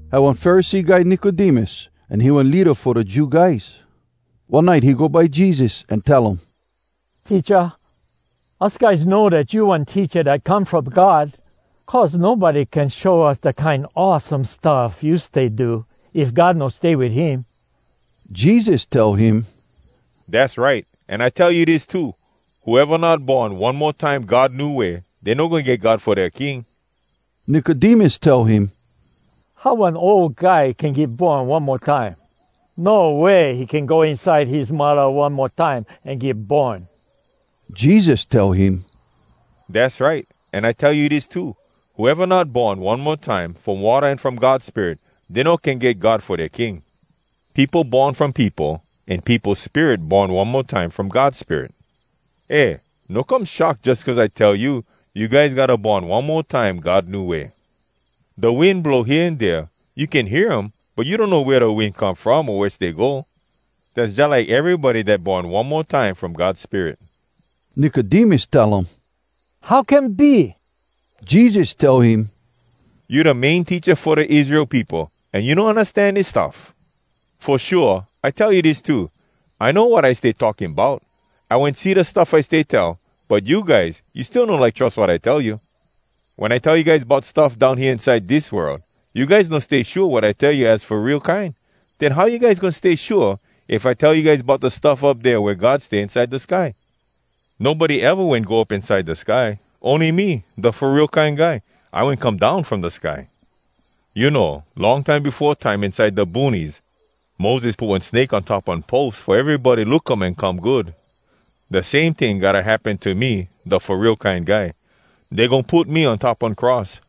Had one Pharisee guy Nicodemus, an he one leada fo da Jew guys. One nite he go by Jesus an tell um, “Teacha, us guys know dat you one teacha dat come from God, cuz nobody can show us da kine awesome stuff you stay do, if God no stay wit him.” Jesus tell him, “Dass right! An I tell you dis too: Whoeva not born one mo time God new way, dey no goin get God fo dea king.” Nicodemus tell him, “How one ol guy can get born one mo time? No way he can go inside his muddah one mo time an get born!” Jesus tell him, “Dass right! An I tell you dis too: Whoeva not born one mo time from watta an from God Spirit, dey no can get God fo dea king. Peopo born from peopo, an peopo spirit born one mo time from God Spirit. Eh, no come shock jus cuz I tell you, ‘You guys gotta born one mo time God new way.’ Da wind blow hea an dea. You can hear um, but you donno wea da wind come from o wea stay go. Dass jalike erybody dat born one mo time from God Spirit.” Nicodemus tell um, “How can be?” Jesus tell him, “You da main teacha fo da Israel peopo, an you no undastan dis stuff? Fo shua, I tell you dis too: I know wat I stay talking bout. I wen see da stuff I stay tell. But you guys, you still no like trus wat I tell you. Wen I tell you guys bout stuff down hea inside dis world, you guys no stay shua wat I tell you az fo real kine. Den how you guys goin stay shua if I tell you guys bout da stuff up dea wea God stay inside da sky? Nobody eva wen go up inside da sky. Ony me, da Fo Real Kine Guy, I wen come down from da sky. “You know, long time befo time inside da boonies, Moses put one snake on top one pos fo erybody look um an come good. Da same ting gotta happen to me, da Fo Real Kine Guy. Dey goin put me on top one cross,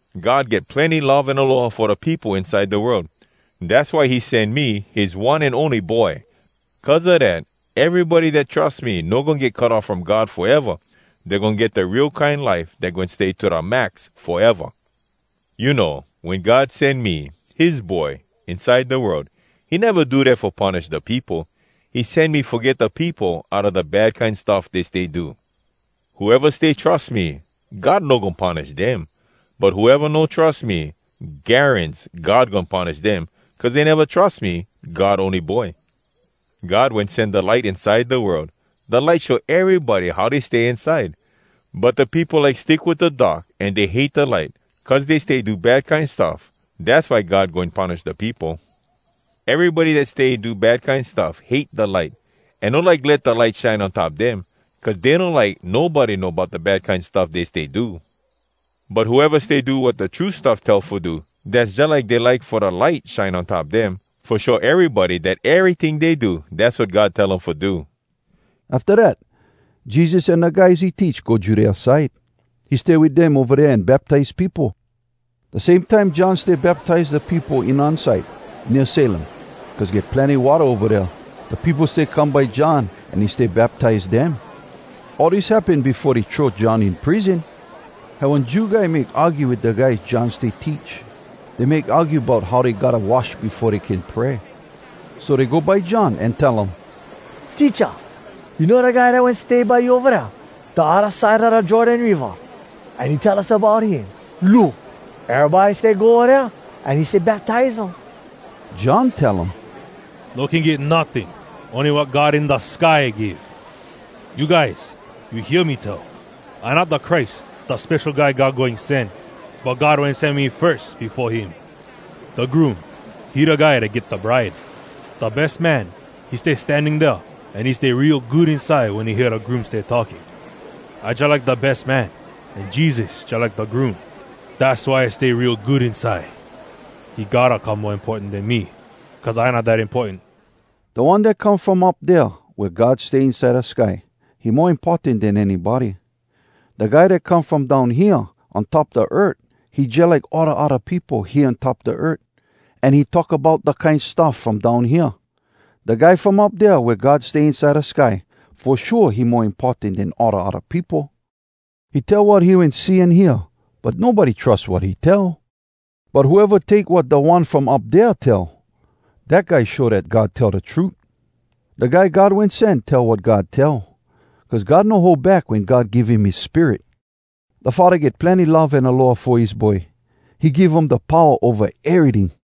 “God get plenny love an aloha fo da peopo inside da world. Dass why he sen me, his one an ony Boy. Cuz a dat, erybody dat trus me no goin get cut off from God foeva! Dey goin get da real kine life dat goin stay to da max foeva! You know, wen God sen me, his Boy, inside da world, he neva do dat fo punish da peopo. He sen me fo get da peopo outa da bad kine stuff dey stay do. Whoeva stay trus me, God no goin punish dem. But whoeva no trus me, garans God goin punish dem, cuz dey neva trus me, God ony Boy. “God wen sen da light inside da world. Da light show erybody how dey stay inside. But da peopo like stick wit da dark an dey hate da light, cuz dey stay do bad kine stuff. Dass why God goin punish da peopo. Erybody dat stay do bad kine stuff hate da light, an no like let da light shine on top dem. Cuz dey no like nobody know bout da bad kine stuff dey stay do. But whoeva stay do wat da true stuff tell fo do, dass jalike dey like fo da light shine on top dem, fo show erybody dat eryting dey do, dass wat God tell um fo do.” Afta dat, Jesus an da guys he teach go Judea side. He stay wit dem ova dea an baptize peopo. Da same time John stay baptize da peopo Enon side, nea Salim, cuz get plenny watta ova dea. Da peopo stay come by John an he stay baptize dem. All dis happen befo dey throw John in prison. Had one Jew guy make argue wit da guys John stay teach. Dey make argue bout how dey gotta wash befo dey can pray. So dey go by John an tell um, “Teacha, you know da guy dat wen stay by you ova dea, da odda side a da Jordan Riva, an you tell us bout him? Look! Erybody stay go ova dea, an he stay baptize um.” John tell um, “No can get notting, ony wat God in da sky give. You guys, you hear me tell, ‘I not da Christ, da Spesho Guy God Goin Sen, but God wen sen me firs, befo him.’ “Da groom, he da guy dat get da bride. Da bes man, he stay standing dea, an he stay real good inside wen he hear da groom stay talking. I jalike da bes man, an Jesus, jalike da groom. Dass why I stay real good inside. He gotta come mo importan den me, cuz I not dat importan.” Da One dat come from up dea wea God stay inside da sky, he mo importan den anybody. Da guy dat come from down hea on top da earth, he jalike all da odda peopo hea on top da earth, an he talk bout da kine stuff from down hea. Da guy from up dea wea God stay inside da sky, fo shua he mo importan den all da odda peopo. He tell wat he wen see an hear, but nobody trus wat he tell. But whoeva take wat da One from up dea tell, dat guy show dat God tell da trut. Da Guy God Wen Sen tell wat God tell, cuz God no hold back wen God give him his Spirit. Da Faddah get plenny love an aloha fo his Boy. He give him da powa ova eryting.